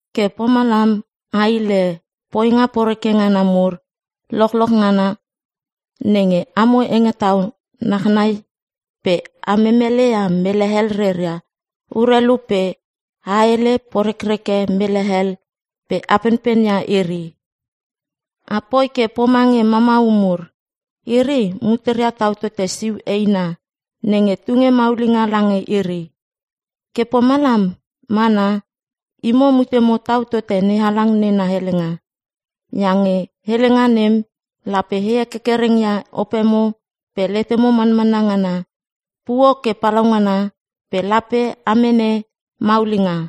Ke pomalam a hile poinga poreke ngana mur lochloch nenge amo hengetau nachnai pe a memeleia mele hel reia urelu pe a hele porekreke mele hel pe a penpen ia iri. Apoi ke pomange mamau mur. Iri muteria tau tote siu eina nenge tunge maulinga lange iri. Ke pomalam mana, imo mutemo tau tote NeHalang nena helenga. Iange helenga nem lape he kerkereng ia opemo pe letemo manmanna ngana puo ke palaungana pe lape a mene maulinga.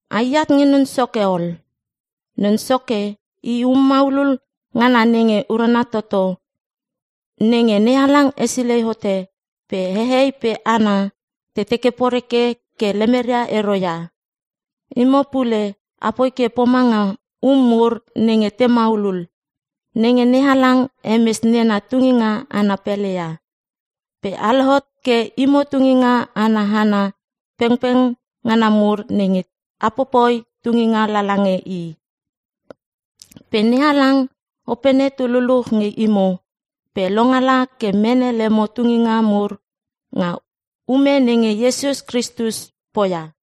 Ai at nge Non Soke ol. Non Soke i um maulul ngana nenge urana toto nenge NeHalang hesilei hote pe hehei pe hana te teke poreke ke lemeria ero ia. Imo pule apoi ke pomanga um mur nenge te maulul nenge NeHalang hemes nena tunginga ana pele ia, pe a lohot ke imo tunginga ana hana pengpeng ngana mur nenge a popoi tunginga lala nge I. Pe NeHalang Opene tu luluch nge imo pe longala ke mene lemo tunginga mur nga ume nenge Iesus Kristus poia.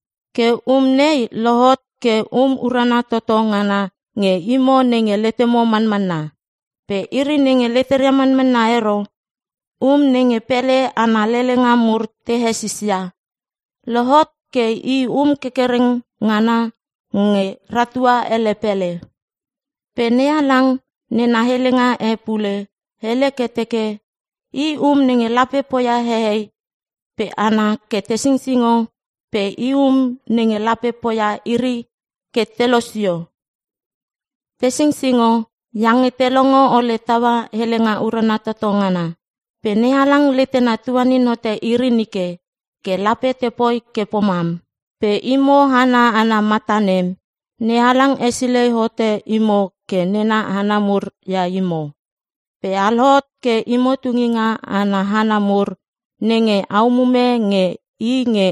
Ke um nei lohot ke um urana toto ngana nge imo nenge letemo manmanna. Pe iri nenge leteria manmanna ero, “Um nenge pele ana lelenga mur te hesis ia, lohot ke i um kerkereng ngana nenge ratua ele pele.” Pe NeHalang nena helenga e pule hele ke teke, “I um nenge lape poia hehei pe hana ke te singsingo pe i um nenge lape poia iri ke te losio.” Te singsingo iange te longo ole taua helenga urana toto ngana. Pe NeHalang letena tuanin hote iri nike ke lape te poi ke pomam. Pe imo hana ana mata nem, NeHalang hesilei hote imo ke nena hana mur ia imo. Pe a lohot ke imo tunginga ana hana mur nenge a umume nge i nge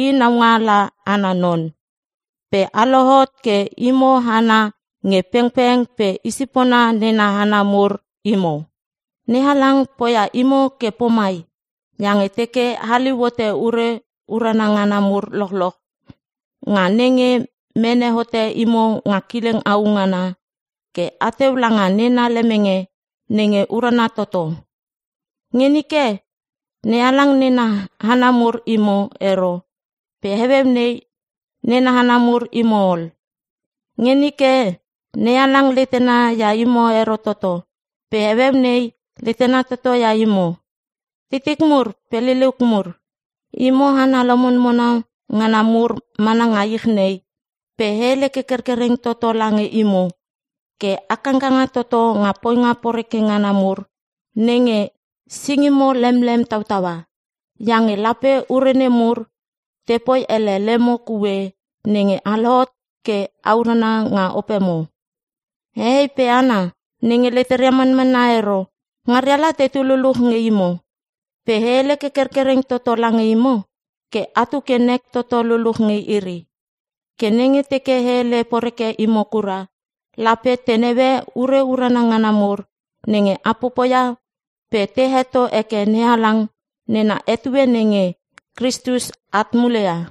i naungaala ana non, pe a lohot ke imo hana nge pengpeng pe isipona nena hana mur imo. NeHalang poia imo ke pomai iange teke a haliu hote ure urana ngana mur lochloch, nga nenge mene hote imo nga kileng au ngana ke ateu langa nena lemenge nenge urana toto. Nge nike, NeHalang nena hana mur imo ero pe heueu nei nena hana mur imo ol. Nge nike NeHalang letena ia imo ero toto pe heueu nei letena toto ia imo. Titik mur pe liliuk mur, imo hana lomonmona ngana mur mana nga ich nei. Pe e hele ke kerkereng toto lange imo ke a kangkanga toto nga poinga poreke ngana nemur nenge singimo lemene tautaua, iange lape ure nemur tepoi ele lemo kue nenge a lohot ke a urana nga opemo. Hehei pe hana nenge leteria manmanna ero, ngaria la tetu luluch nge imo pe e hele ke kerkereng toto lange imo ke atu ke nek toto luluch nge iri. Ke nenge teke te hele poreke imo kura lape te naue ure urana ngana mur nge a popoia pe te heto heke NeHalang nga etue nenge Kristus at mule ia.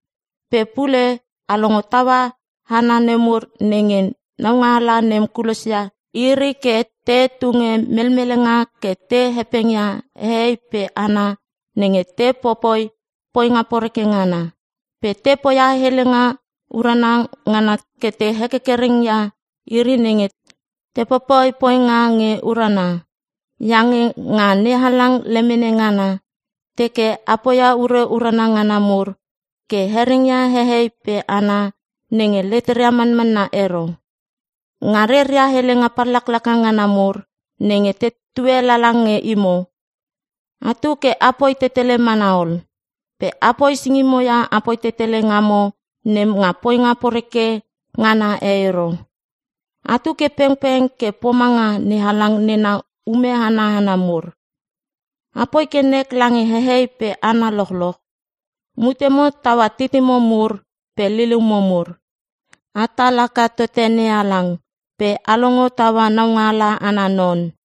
Pe pule a longo taua hana nemur nenge naungaala nem kulosia iri ke te tunge melmelenga ke te hepengia hehei pe hana nenge te popoi poinga poreke ngana. Pe te poia helenga urana ngana ke te hekerkereng ia iri nenge te popoi poinga nge urana. Iange nga NeHalang lemene ngana, teke a poia ure urana ngana mur ke hereng ia hehei pe hana nenge leteria manmanna ero, nga reria helenga pallaklaka ngana mur nenge tetue lala nge imo. Atu ke apoi tetele mana ol. Pe apoi singimo ia apoi tetele ngamo nem nga poinga poreke ngana e ero. Atu ke pengpeng ke pomanga NeHalang nena ume ana hana mur. Apoi ke nek lange hehei pe hana lochloch. Mutemo taua titimo mur pe liliumo mur. Atal haka tote NeHalang. Pe a longo taua naungaala ana non.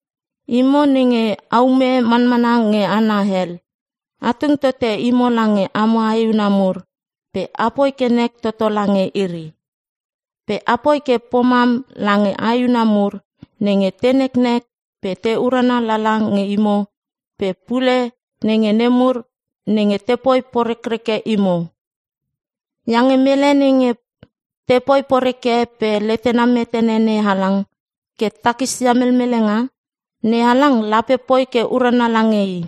Imo nenge aume manmana nge hana hel, a tung tote imo lange amo aehuna mur pe apoi ke nek toto lange iri. Pe apoi ke pomam lange aehuna nemur nenge te neknek pe te urana lala nge imo pe pule nge nemur nenge tepoi porekreke imo. Iange mele nenge tepoi poreke pe letena metene NeHalang ke takisia melmelenga, NeHalang lape poi ke urana lange i.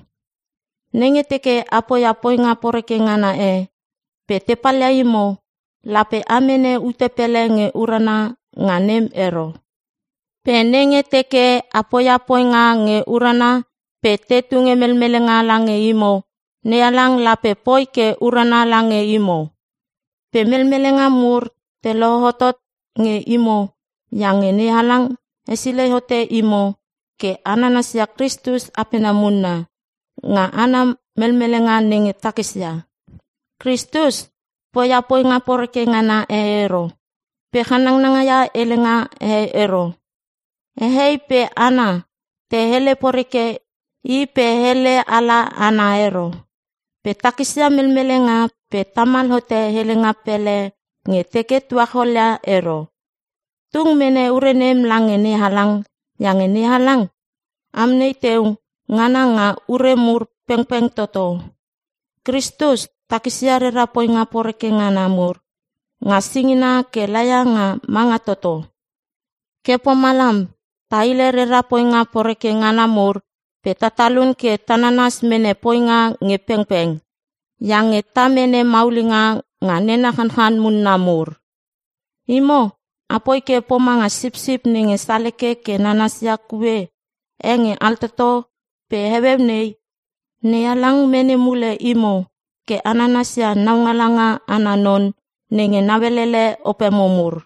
Nenge teke a poia poinga poreke ngana e pe te palia imo, lape a mene ute pele nge urana nga nem ero. Pe nenge teke a poia poinga nge urana pe te tunge melmelenga lange imo, NeHalang lape poi ke urana lange imo. Pe melmelenga mur te lohotot nge imo iange NeHalang hesilei hote imo ke a nanasia Kristus apena munna nga ana melmelenga nenge takisia. “Kristus poia poinga poreke ngana e ero, pe channanga ia helenga e ero.” Hehei pe hana te hele poreke i pe hele ala ana ero, pe takisia melmelenga pe tamal hote helenga pele nge teke tuacholia ero. Tung mene ure nem lange NeHalang iange NeHalang amnei teu ngana nga ure mur pengpeng toto. Kristus takisia rera poinga poreke ngana mur nga singina ke laia nga manga toto. Ke pomalam ta hile rera poinga poreke ngana mur pe ta talun ke ta nanas mene poinga nge pengpeng, iange ta mene maulinga nga nena chanchan munna mur. Imo apoi ke pomanga sipsip nenge saleke ke nanasia kue e nge altoto pe heueu nei, NeHalang mene mule imo ke a nanasia naualanga ana non nenge nauelele opemo mur.